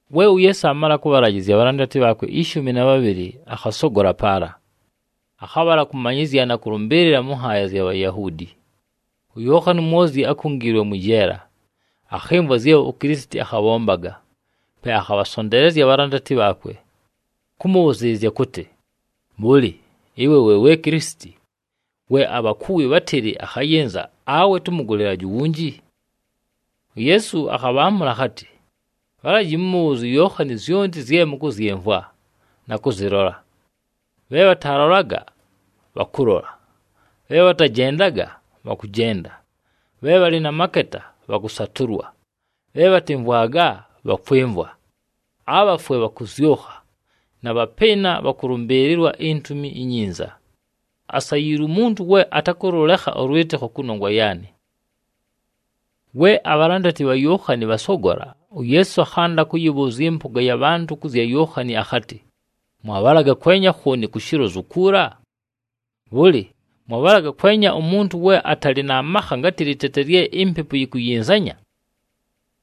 We uYeesu aamala kʉbhalajɨzya abhalandati bhaakwe ishumi na bhabhɨlɨ, akhasogola paala. Akhabhala kʉmanyɨzya na kʉlʉmbɨɨlɨla mʉ nhaaya zya Bhayahuudi. UYookhani uMwozyi we akungiilwe mwɨ jeela, akhɨmvwa zye uKilisiti akhabhombaga. Pe akhabhasonteelezya abhalandati bhaakwe, kʉmʉbhʉzɨɨlɨzya kʉtɨ, “Bhʉlɨ, ɨwe we Kilisiti we abhakuwi bhátɨlɨ akhayɨnza, awe tʉmʉgʉlɨlaje uwunji?” UYeesu akhabhaamʉla akhatɨ, “Bhalaji mʉmʉbhʉʉzye uYookhani zyonti zye mʉkʉzyɨmvwa na kʉzɨlola: bhe bhatalolaga bhakʉlola, bhe bhatajendaga bhakʉjenda, bhe bhalɨ na maketa bhakʉsatʉlwa, bhe bhatɨmvwaga bhakwɨmvwa, abhafwe bhakʉzyʉkha, na bhapɨɨna bhakʉlʉmbɨɨlɨlwa iNtumi iNyinza. Asayiilwe umuntu we atakʉlʉlekha ʉlwɨtɨkho kʉnongwa yaanɨ.” We abhalandati bha Yookhani bhasogola, uYeesu akhanda kʉyɨbhʉʉzya ɨmpʉga ya bhantʉ kʉ zya Yookhani akhatɨ, “Mwabhalaga kwenya khooni ku shilozu kuula? Bhʉlɨ, mwabhalaga kwenya umuntu we atalɨ na makha ngatɨ lɨtete lye impepu yikuyinzanya?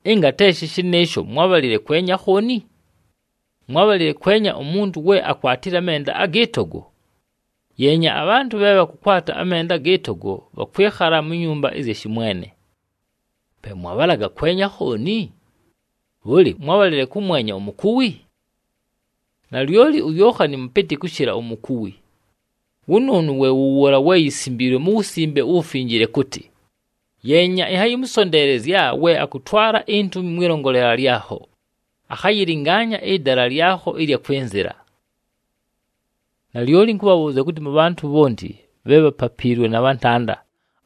Ɨnga te shɨ shɨnɨɨsho, mwábhalile kwenya khooni? Mwábhalile kʉmwenya umuntu we akwatile amenda agɨ togo? Yeenya, abhantʉ bhe bhakʉkwata amenda agɨ togo bhakwɨkhala mu nyumba ɨzya shɨmwene. Pe mwabhalaga kwenya khooni? Bhʉlɨ, mwábhalile kʉmwenya umukuwi? Nalyoli uYookhani mʉpɨtɨ kʉshɨla umukuwi. Wʉnʉʉnʉ we wʉ wʉʉla we yisimbiilwe mu Wusimbe uWufinjile kʉtɨ, ‘Yeenya, ɨnhayɨmʉsonteelezya we akʉtwala intumi mwɨlongolela lyakho, akhayɨlɨngaanya ɨdala lyakho ɨlya kwɨnzɨla.’” Nalyoli ɨnkʉbhabhʉʉzya kʉtɨ, mʉ bhantʉ bhonti bhe bhapapiilwe na bhantanda,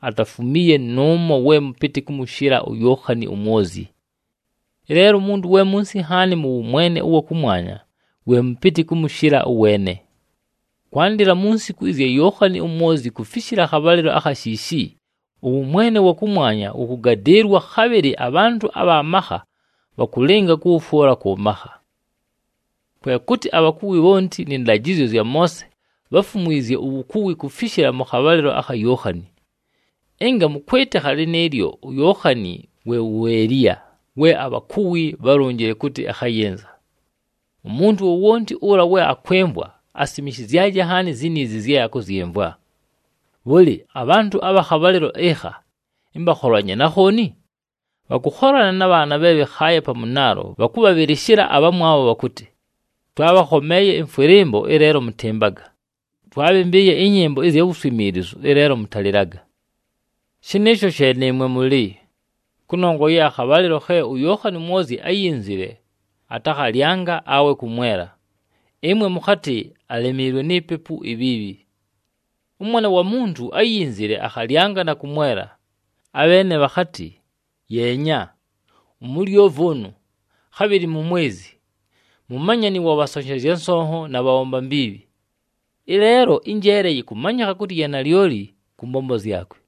atafumiiye nʉʉmo we mʉpɨtɨ kʉmʉshɨla uYookhani uMwozyi. Ɨleelo, umuntu we munsi nhaani mʉ wʉmwene ʉwa kʉmwanya, we mʉpɨtɨ kʉmʉshɨla ʉweene. Kwandɨla mu nsiku ɨzya Yookhani uMwozyi kufishila akhabhalɨlo akha shiishi, ʉwʉmwene ʉwa kʉmwanya wʉkʉgadɨɨlwa, khabhɨlɨ abhantʉ abha makha bhakʉlɨnga kʉwʉfwʉla kʉ makha. Kwe kʉtɨ abhakuwi bhonti nɨ ndajɨzyo zya Moose bháfumwizye uwukuwi kufishila mʉ khabhalɨlo akha Yookhani. Ɨnga mʉkwɨtɨkha lɨnɨɨlyo, uYookhani we wu Eliya we abhakuwi bhálonjile kʉtɨ akhayɨnza. Umuntu wowonti ʉla we akwɨmvwa, asimishizyaje nhaani ziniizi zye akʉzyɨmvwa! “Bhʉlɨ, abhantʉ abha khabhalɨlo ɨkha ɨmbakholanye na khooni? Bhakʉkholana na bhaana bhe bhɨkhaaye pa mʉnaalo bhakʉbhabhɨlɨshɨla abhamwabho bhakʉtɨ, ‘Twaabhakhomeeye ɨmfwɨlɨmbo, ɨleelo mʉtɨmbaga! Twaabhɨmbɨɨye ɨnyɨmbo ɨzya wuswimiilizu, ɨleelo mʉtalɨlaga!’ Shɨnɨɨsho she nɨɨmwe mʉlɨ, kʉnongwa ye akhabhalɨlo khe uYookhani uMwozyi áyinzile, atakhalyanga awe kʉmwela, ɨmwe mʉkhatɨ, ‘Alemiilwe ni pepu ibhiibhi!’ ɄMwana wa Muntu áyinzile, akhalyanga na kʉmwela, abheene bhakhatɨ, ‘Yeenya! Umulyovi ʉnʉ, khabhɨlɨ mumwezi, mumanyani wa bhasonshezya nsonho na bhabhomba mbiibhi!’ Ɨleelo ɨnjeele yɨkʉmanyɨkha kʉtɨ ya nalyoli kʉ mbombo zyakwe.”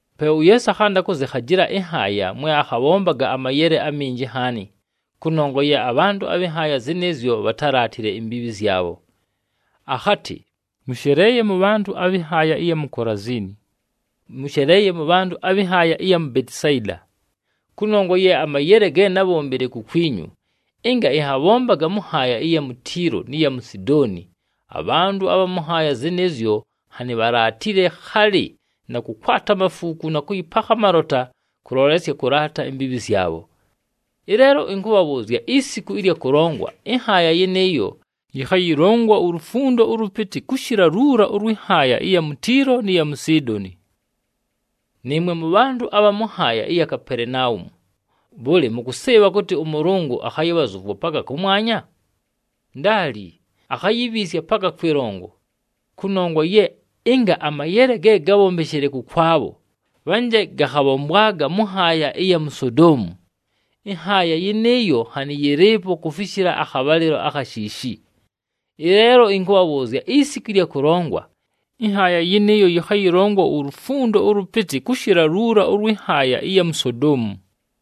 Pe uYeesu akhanda kʉzɨkhajɨla ɨnhaaya mwe akhabhombaga amayele aminji nhaani kʉnongwa ye abhantʉ abhɨ nhaaya zɨnɨɨzyo bhatálaatile imbiibhi zyabho. Akhatɨ, “Mʉsheleeye mʉbhantʉ abhɨ nhaaya ɨya mu Kolaziini! Mʉsheleeye mʉbhantʉ abhɨ nhaaya ɨya mu Betisayida! Kʉnongwa ye amayele ge nábhombile kukwinyu, ɨnga ɨnhabhombaga mʉ nhaaya ɨya mu Tiilo nɨ ya mu Sidooni, abhantʉ abha mʉ nhaaya zɨnɨɨzyo nhanɨ bhalaatile khalɨ na kʉkwata amafuuku na kʉyɨpakha amalota kʉlolesya kʉlaata imbiibhi zyabho. Ɨleelo, ɨnkʉbhabhʉʉzya isiku ɨlya kʉlongwa, ɨnhaaya yɨnɨɨyo yɨkhayɨlongwa ulufundo ʉlʉpɨtɨ kʉshɨla luula ʉlwɨ nhaaya ɨya mu Tiilo nɨ ya mu Sidooni! Nɨɨmwe mʉbhantʉ abha mʉ nhaaya ɨya mu Kapelenaumu, bhʉlɨ, mʉkʉsɨɨbha kʉtɨ ʉMʉlʉngʉ akhayɨbhazʉvwa paka kʉmwanya? Ndaali! Akhayibhiisya paka kwɨlongo! Kʉnongwa ye ɨnga amayele ge gábhombeshile kʉkwabho, bhanje gakhabhombwaga mʉ nhaaya ɨya mu Sodoomu, ɨnhaaya yɨnɨɨyo nhanɨ yɨlɨɨpo kufishila akhabhalɨlo akha shiishi. Ɨleelo ɨnkʉbhabhʉʉzya isiku ɨlya kʉlongwa, ɨnhaaya yɨnɨɨyo yɨkhayɨlongwa ulufundo ʉlʉpɨtɨ kʉshɨla luula ʉlwɨ nhaaya ɨya mu Sodoomu!”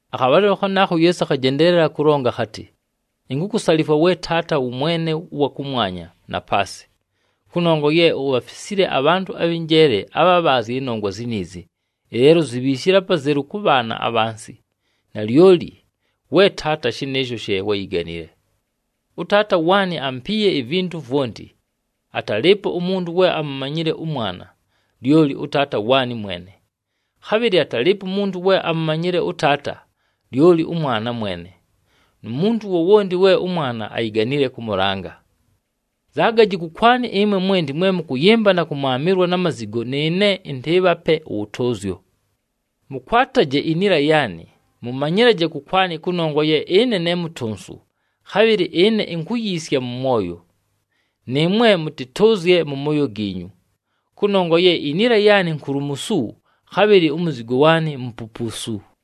Akhabhalɨlo khanaakho uYeesu akhajendeelela kʉlonga akhatɨ, “Inkukusalifwa we Taata, wʉMwene ʉwa kʉmwanya na paasɨ, kʉnongwa ye ubhafisile abhantʉ abhɨ njeele na bhabhaazye ɨnongwa ziniizi, ɨleelo uzibhiishile apazelu kʉ bhaana abhansi. Nalyoli we Taata, shɨnɨɨsho she wáyiganile. “ɄTaata waanɨ ampiiye ivintu vwonti. Atalɨɨpo umuntu we amumanyile ʉMwana, lyoli ʉTaata waanɨ mwene. Khabhɨlɨ atalɨɨpo umuntu we amumanyile ʉTaata, lyoli ʉMwana mwene, nu muntu wowonti we ʉMwana ayiganile kʉmʉlanga. “Nzaagaji kʉkwanɨ ɨmwe mwenti mwe mʉkʉyɨmba na kʉmwamɨlwa na mazigo, nɨɨne ɨntɨɨbhape ʉwʉtʉʉzyo. Mʉkwataje iniila yaanɨ, mʉmanyɨlaje kʉkwanɨ kʉnongwa ye ɨne ne mutonsu, khabhɨlɨ ɨne inkuyiisya mʉ mwoyo, nɨɨmwe mʉtɨtʉʉzye mʉ mooyo giinyu. Kʉnongwa ye iniila yaanɨ nkulumusu, khabhɨlɨ umuzigo waanɨ mupupuusu.”